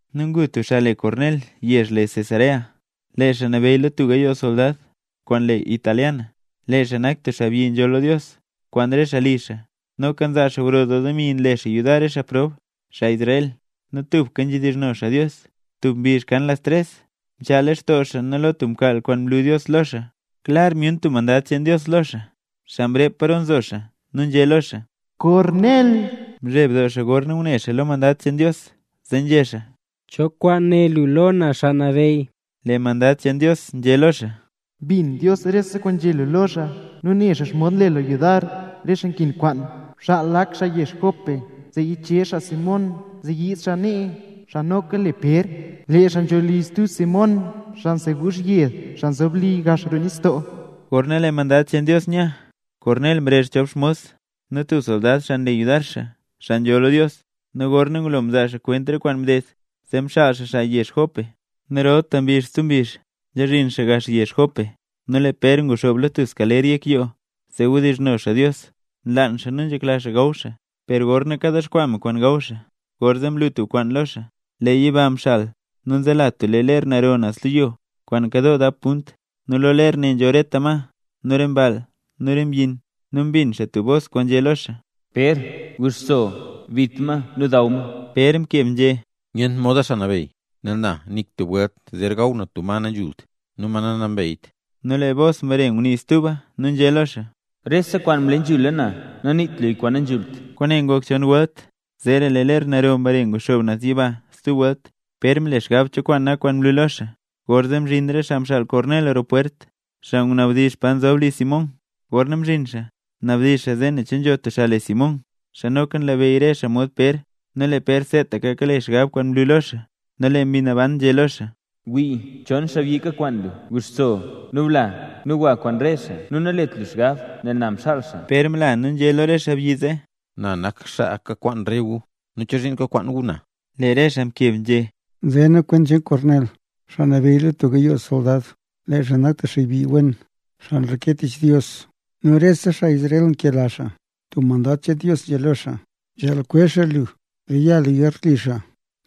Nu ngu tub xaa le Kornel yezh le Cesarea, lee xaa nabeyy lo tub gayoo soldad, kwaan le Italia. Lee xaa nak tub xaabyi nzholl lo Dios, kwaan rese xaa li xaa. Noka nzaa xaa gro doo demi nle xaa yudar re xaa prob, xaa Israel, nu tubka nzhedizhno xaa Dios. Tub mbizh kan las tres, mchaa lextoo xaa nu lo tub mkaal kwaan mlu Dios lo xaa, klar myun tub mandad cheen Dios lo xaa, xaa mrep paro nzo xaa nu nzhé lo xaa: —¡Kornel! Mzheb doo xaa gorna ngune xaa lo mandad cheen Dios zee nzhé xaa: —¿Cho kwaan né lu lo na, Xaa Nabeyy? Lee mandad cheen Dios nzhé lo xaa: —Mbin Dios rese kwaan nzhé lu lo xaa nu ne xaa xomod nle lu yudar re xaa nkin kwaan. Bxaal lak xaa yezh Jope zee yichezh xaa Simón zee yiid Simón nee, xaa noka le Pér. Lee xaa nzho li stub Simón, xaa nseguuzh yed, xaa nzob li gax roo nistoo. Gorna lee mandad cheen Dios nya, Kornel mrezh chop xmos, nu tub soldad, xaa nle yudar xaa, xaa nzholl lo Dios. Nu gorna ngulo mzaa xaa kwent re kwaan mded, zee mxaal xaa xaa yezh Jope. Nu rolta mbizh stub mbizh nzhazhin xaa gax yezh Jope. Nu lee Pér nguxoob lo tub skaler yek yoo zee wdizhno xaa Dios. Nlaan xaa nu nzhekla xaa gaw xaa, per gorna kadexkwaa me kwaan gaw xaa, gorzee mlu tub kwaan lo xaa, lee yiba mxal nu nzela tub lee ler naro naz lo yo, kwaan nkadoo dap punt. Nu lo ler nzho rete ma, nu re mball, nu re mbyin. Nu mbin xaa tub bos kwaan nzhé lo xaa: —Pér, guxso, bit ma nu daw ma. Pér mkeb nzhé: —Nyent moda, Xaa Nabeyy; nel na nik tub welt zer gaw na tub ma nanzhult nu ma nanambeyt. Nu lee bos mbare ngunii stuba, nu nzhé lo xaa: —Rese kwaan mle nzhula na, naniit luya kwaan nanzhult. Kwaane ngok chon welt, nu zeera lee ler naro mbare nguxoob naz yiba stub welt. Pér mle xgab cho kwaan nak kwaan mlu lo xaa, gorzee mzhin re xaa mxaal Kornel roo pwert, xaa ngunabdizh pa nzob li Simón. Gorna mzhin xaa, mnabdizh xaa zee ne che nzho tub xaa le Simón, xaa noka nlabeyy re xaa mod Pér. Nu lee Pér seetaka kale xgab kwaan mlu lo xaa, nu lee Mbi Naban nzhé lo xaa: —Wii, chon xaabyi kakwaan lu. Guxso, nu bla, nu gwa kwaan re xaa, nu nalet lu xgab, nel na mxaal xaa. Pér mla nu nzhé xaa lo re xaabyi zee: —Na nak xaa kakwaan re gu. ¿Nu chozhiin kakwaan gu na? Lee re xaa mkeb nzhé: —Nze nu kwent cheen Kornel, xaa nabeyy lo tub gayoo soldad. Lee xaa nak tub xaabyi wen, tub xaa nreke tich Dios, nu rese xaa Israel nkela xaa. Tub mandad cheen Dios nzhé lo xaa, nzhaal kwezh xaa lu, zee ya lu garli xaa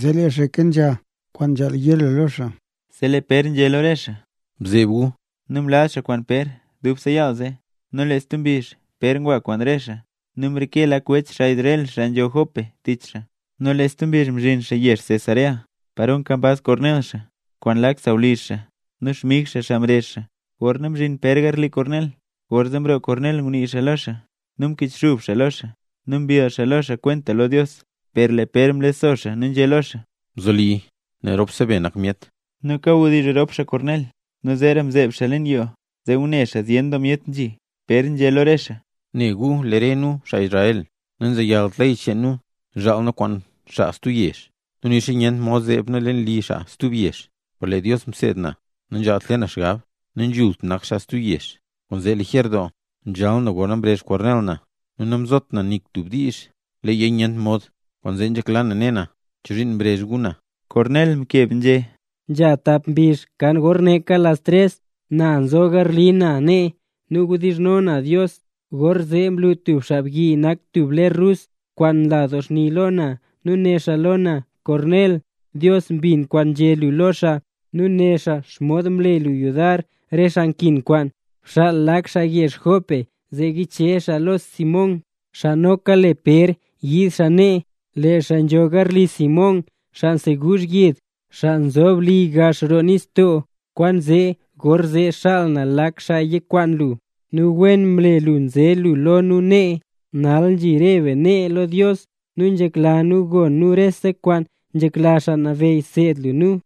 zee lee xaa kenzha kwaan nzhaal yé lu lo xaa. Zee lee Pér nzhé lo re xaa: —Bzeeb gu. Nu mlaz xaa kwaan Pér dubse yaal zee. Nu lee stub mbizh, Pér ngwa kwaan re xaa, nu mreke lak wech, xaa Israel xaa nzho Jope, tich xaa. Nu lee stub mbizh mzhin xaa yezh Cesarea, paro nkambaz Kornel xaa, kwaan lak sawlizh xaa nu xmig xaa, xaa mrezh xaa. Gorna mzhin Pér garli Kornel, gorzee mroo Kornel ngunii lo xaa, nu mkichxub xaa lo xaa, nu mbill xaa lo xaa kwenta lo Dios. Per lee Pér mlexso xaa nu nzhé lo xaa: —Bzoli, nel ropse be nak myet. Nu kayadizh rop xaa Kornel, nu zeera mzeeb xaa leen yoo zee ngune xaa zyen doo myet nzhi. Pér nzhé lo re xaa: —Ne gu lee re nu, xaa Israel, nanzeyalt ley cheen nu zhaal nu kwaan xaa stub yezh nu nixa nyent mod zeeb nu leen li xaa stub yezh. Per lee Dios mseed na, nanzhaalt le na xgab nanzhult nak xaa stub yezh. Kwaanzee lijer doo nzhal na gorna mrezh Kornel na, nu namzot na nik tub diizh leeya nyent mod. Kwaanzee nzhekla na ne na, chozhiin mrezh gu na. Kornel mkeb nzhé: —Nzha tap mbizh kan gor neeka las tres, na nzo garli na nee nu kawdizhno na Dios, gorzee mlu tub xaabyi nak tub ler rus kwaan nla doo xni lo na. Nu né xaa lo na: “Kornel, Dios mbin kwaan nzhé lu lo xaa, nu ne xaa xomod mle lu yudar re xaa nkin kwaan. Bxaal lak xaa yezh Jope zee yichezh xaa lo Simón, xaa noka le Pér yiid xaa nee. Lee xaa nzho garli Simón, xaa nseguuzh yed, xaa nzob li gax roo nistoo.” Kwaanzee gorzee mxaal na lak xaa yakwaan lu, nu wen mle lu nze lu lo nu nee. Nal nzhi re be nee lo Dios, nu nzhekla nu gon nu rese kwaan nzhekla Xaa Nabeyy seed lu nu.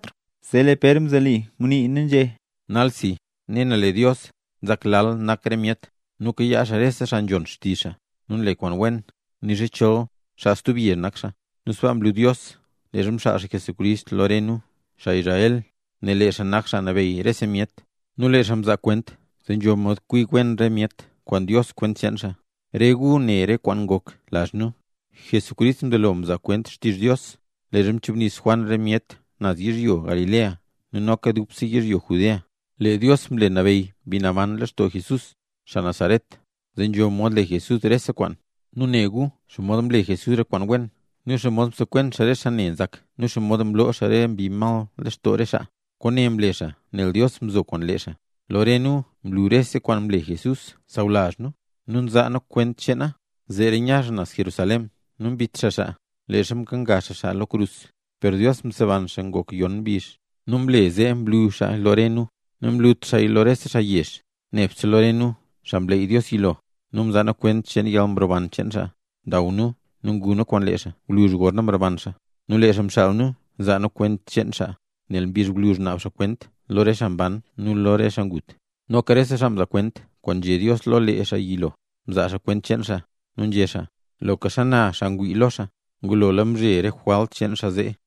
Zee lee Pér mzelo ngunii, nu nzhé: —Nalsi, ne na lee Dios nzak lal nak re myet, nu nkayaa xaa rese xaa nzhon xtizh xaa nu nle kwaan wen, nixa chol xaa stub yezh nak xaa. Nu sbaa mlu Dios leezha mxaal xaa Jesucrist lo re nu, xaa Israel, nel lee xaa nak Xaa Nabeyy rese myet. Nu lee xaa mzaa kwent zee nzho mod kwi wen re myet kwaan Dios kwent cheen xaa. Re gu ne re kwaan ngok lazh nu. Jesucrist mzelo mzaa kwent xtizh Dios leezha mchubnis Juan re myet naz yizhyo Galilea nu noka dubse yizhyo Judea. Lee Dios mle nabeyy Mbi Naban lextoo Jesús, xaa Nazaret, zee nzho mod le Jesús rese kwaan. Nu ne gu xomod mle Jesús re kwaan wen, nu xomod msekwen xaa re xaa ne nzak nu xomod mloo xaa re mbi mal lextoo re xaa. Kwaane mle xaa nel Dios mzo kwaan lee xaa. Lo re nu mlu rese kwaan mle Jesús sawlazh nu, nu nzaa nu kwent cheena. Zeera nya xaa naz Jerusalén, nu mbit xaa xaa, leezha mkenga xaa xaa lo tub krus. Per Dios mseban xaa ngok yon mbizh, nu mle zee mlu xaa lo re nu. Namlut xaa lo rese xaa yezh, nebse lo re nu, xaa mleey Dios yilo, nu nzaa nu kwent cheen yalmroban cheen xaa. Ndaw nu nu ngu nu kwaan lee xaa gwluzh gorna mroban xaa. Nu lee xaa mxaal nu zaa nu kwent cheen xaa, nel mbizh gwluzh naab xaa kwent lo re xaa mban nu lo re xaa ngut. Noka rese xaa mzaa kwent kwaan nzhé Dios lo lee xaa yilo, mzaala xaa kwent cheen xaa, nu nzhé xaa: “Loka xana xaa ngwii lo xaa, ngulola mzhe re jwalt cheen xaa zee”.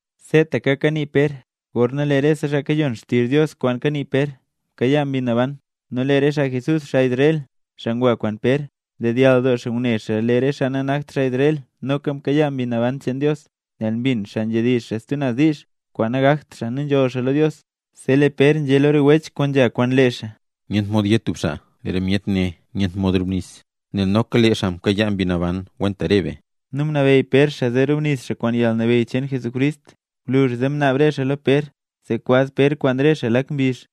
Seetaka kanii Pér, gorna lee rese xaa kayon xtizh Dios kwaan kanii Pér, mkayaa Mbi Naban. Nu lee rese xaa Jesús, xaa Israel, xaa ngwa kwaan Pér, ndedyall doo ngune lee re xaa nanakt xaa Israel noka mkayaa Mbi Naban cheen Dios, nel mbin xaa nzhedizh xaa stub naz diizh kwaan nagakt xaa nu nzholl xaa lo Dios. Zee lee Pér nzhé lo re wech kwaan nzha kwaan lee xaa: —Nyent mod yé tub xaa lee re myet nee nyent mod rubnis, nel noka lee xaa mkayaala Mbi Naban kwenta re be. Nu mnabeyy Pér xaa zee rubnis xaa kwaan yalnabeyy cheen Jesucrist. Gwluzh zee mnaab re xaa lo Pér zee kwaz Pér kwaan re xaa lak mbizh.